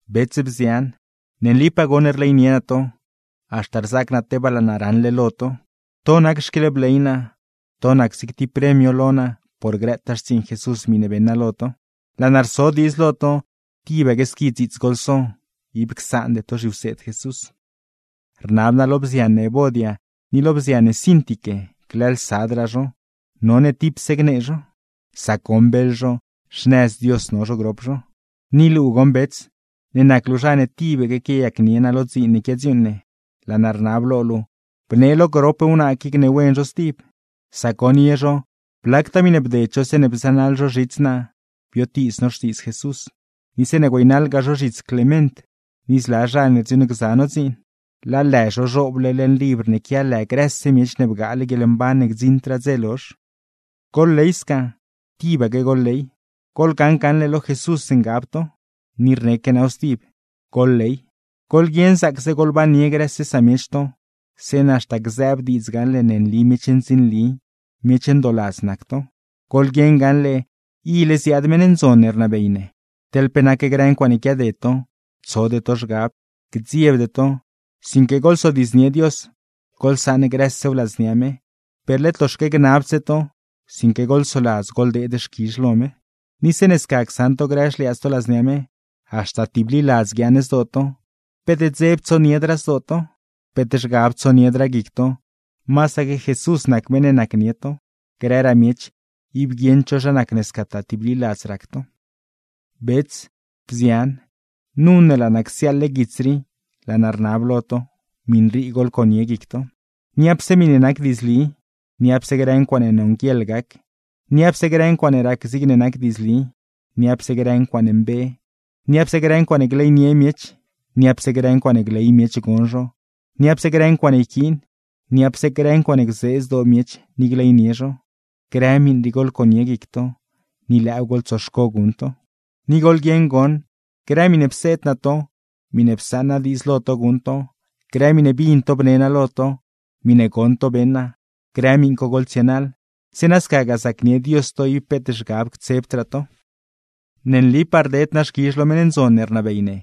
Bets, bzian, ne nlipaa goṉ rleynie naa to, haxta rzaac naa tebaa laa naa raṉle lo to; to nac xquieḻbley naa, to nac zig tib premio lo naa por grëtaa xtsiiṉ Jesús miṉe beṉ naa lo to. Laa naa rso diidz lo to, tibaque squi dziits goḻso, ib csaande to zhiwseed Jesús. Rnab naa lo bzian ne Evodia, ni lo bzian ne Síntique glëëlsadraa zho, none tipse gnee zho; sac goṉ beḻ zho, xnëz Dios no zho grop zho. Ni luu goṉ bets, ne nac luu zha ne tibaque quiayacnie naa lo dziin ne quiadziuuṉ ne, laa naa rnab lo luu bnee lo grop wnaa qui gneewen zho stib, sac goṉ ye zho blactaa miṉe bded zho zeeṉe bzënaḻ zho zhits naa biotiiz no Xtiidz Jesús, ni zeeṉe güeynaḻgaa zho zhits Clement, ni zla zha ne rdziuuṉgza no dziin. Laa lë zho zhooble leṉ libr ne quia lë grëse miech ne bgaale guieḻmban ne gdziṉdraa dze lozh. ¡Goḻley sca, tibaque goḻley! ¡Goḻgaṉ gaṉle lo Jesús ngab to! Ni rneque naaw stib: ¡Goḻley! Goḻguieṉ zaacse goḻbannie grëse samiech to, zeeṉa haxta gzëëb diidz gaṉle ne nli miech ndzinli, miech ndooladz nac to. ¡Goḻguieṉ gaṉle, ile ziaad meṉ ndzon ne rnabey ne! Teḻ pe nac grë ncuaaṉe quiaded to, tsode to zhgab, gdziebde to, sinque goḻzodiidznie Dios, goḻsaṉ grësew ladznia me; per led loxaque gnabdse to, sinque goḻsoladz goḻdeed xquizh lo me. Ni zeeṉe sca csaṉ to grë xliaadz to ladznia me, haxta tibliladz guiaaṉ zdoo to, peet dzeb tsoniedraa zdoo to, peet zhgab tsoniedraa guic to, masaque Jesús nac meṉ ne nacnie to; grëraa miech ib guieṉd zho zha nac ne scataa tibliladz rac to. Bets, bzian, nu ne laa naa csiaaḻle guits rii laa naa rnab lo to, miṉ rii goḻconie guic to: niapse miṉe nac diidzli, niapse grë ncuaaṉe nonguieḻ gac, niapse grë ncuaaṉe rac zigne nac diidzli, niapse grë ncuaaṉe mbe, niapse grë ncuaaṉe gleynie miech, niapse grë ncuaaṉe gley miech gon zho, niapse grë ncuaaṉe yquiin, niapse grë ncuaaṉe gzee zdoo miech ni gleynie zho. Grë miṉ rii goḻconie guic to, ni lëëw goḻtsoxco guṉ to. Ni goḻguieṉ goṉ, grë miṉe pseed naa to, miṉe psaṉ naa diidz lo to guṉ to, grë miṉe bin to bne naa lo to, miṉe goṉ to beṉ naa, grë miṉ co goḻtsienaḻ; zeeṉa scagaa zacnie Dios to ib peet zhgab ctsebdraa to. Ne nlipaa rded naa xquizh lo meṉ ndzon ne rnabey ne,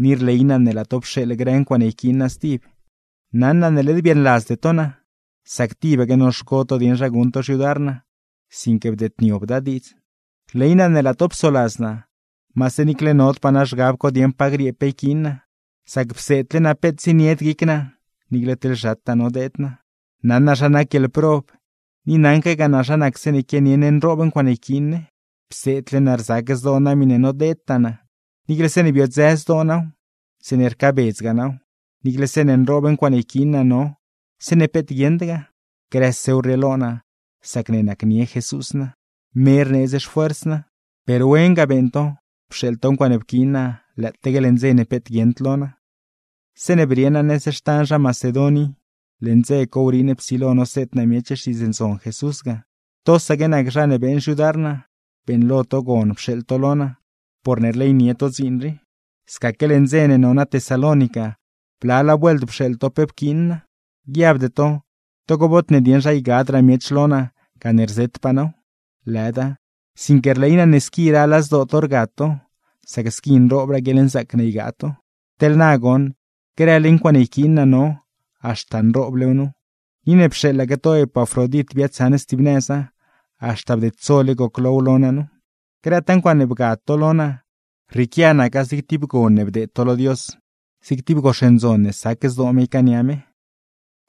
ni rley naa ne laa to pxeeḻ grë ncuaaṉe yquiin naa stib. Naṉ naa ne led biaaṉladzde to naa, sac tibaque noxco to dieṉ zha guṉ to xyudar naa; sinque bdeedniobda diidz. Rley naa ne laa to psoladz naa, maase niicle nodpaa naa zhgab co dieṉ pa griee pe yquiin naa, sac pseedle naa peet zienied guic naa niicle teḻ zhataa nodeed naa. Naṉ naa zha nac guieḻprob, ni naṉquegaa naa zha nac zeeṉe quianie ne nroob ncuaaṉe yquiin ne. Pseedle naa rzac zdoo naa miṉe nodeedtaa naa, niicle zeeṉe biodzë zdoo naaw, zeeṉe rcaabedzgaa naaw; niicle zeeṉe nroob ncuaaṉe yquiin naa no, zeeṉe peet guieṉdgaa. ¡Grësew rrieelo naa, sacne nacnie Jesús naa, me rneedz xfuers naa! Per wen ga beeṉ to, pxeeḻ to ncuaaṉe pquiin naa lëëtaque leṉ dze ne peet guieṉd lo naa. Zeeṉe brie naa nëz xtan zha Macedon i, leṉ dze ne wriiṉ psilo noseed naa miech Xtiidz Ndzon Jesús ga, tosaque nac zha ne beeṉ xyudar naa, beeṉlo to gon pxeeḻ to lo naa, porne rleynie to dziin rii. Scasaque leṉ dze ne no naa Tesalónica, blalaa vuelt pxeeḻ to pe pquiin naa. Guiabde to togo bod ne dieṉ zha ygadraa miech lo naa gane rzetpaa naaw; lëda, sinque rley naa ne squi rala zdoo to rgad to, sac squi nroobraa guieḻnzaac ne ygaa to. Teḻ na goṉ, grële ncuaaṉe yquiin naa no, haxta nrooblew nu. Ni ne pxeeḻaque to Epafrodit biaadsaṉ stib nëza, haxta bdedsole goclow lo naa nu. Grëtaa ncuaaṉe bgad to lo naa, rrieequia naca zig tib gon ne bdeed to lo Dios, zig tib gox ndzon ne sac zdoo me ycaania me.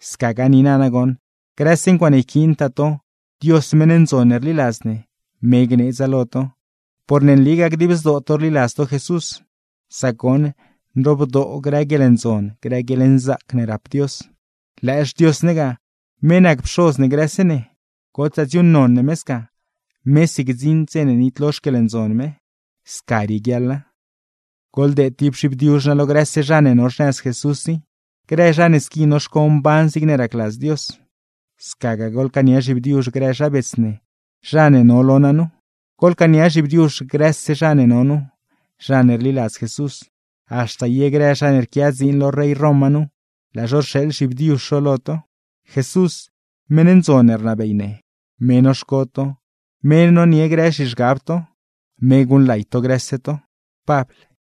Scagaa niina nagoṉ, grëse ncuaaṉe yquiintaa to, Dios meṉ ndzon ne rliladz ne, me gneedza lo to, porne nligaa dib zdoo to rliladz to Jesús; sac goṉ, nroobdoo grë guieḻndzon, grë guieḻnzaac ne rap Dios. ¡Lëë xDios ne ga, me nac Pxoz ne grëse ne! ¡Gotsaa dziuuṉnon ne me sca, mesi gdziṉd dze ne nitlo xquieḻndzon me! Sca rieguiaḻa. Goḻdeed tib zhibdiuzh naa lo grëse zha ne no xnëz Jesús i, grë zha ne squi noxco mban zigne racladz Dios. Scagaa goḻcaania zhibdiuzh grë zha bets ne, zha ne no lo naa nu. Goḻcaania zhibdiuzh grëse zha ne no nu, zha ne rliladz Jesús; haxta ye grë zha ne rquia dziin lo rey Roma nu, laa zho rxeeḻ zhibdiuzh zho lo to. Jesús, meṉ ndzon ne rnabey ne; me noxco to, me nonie grë zhizhgab to. ¡Me guṉlay to grëse to! Pabl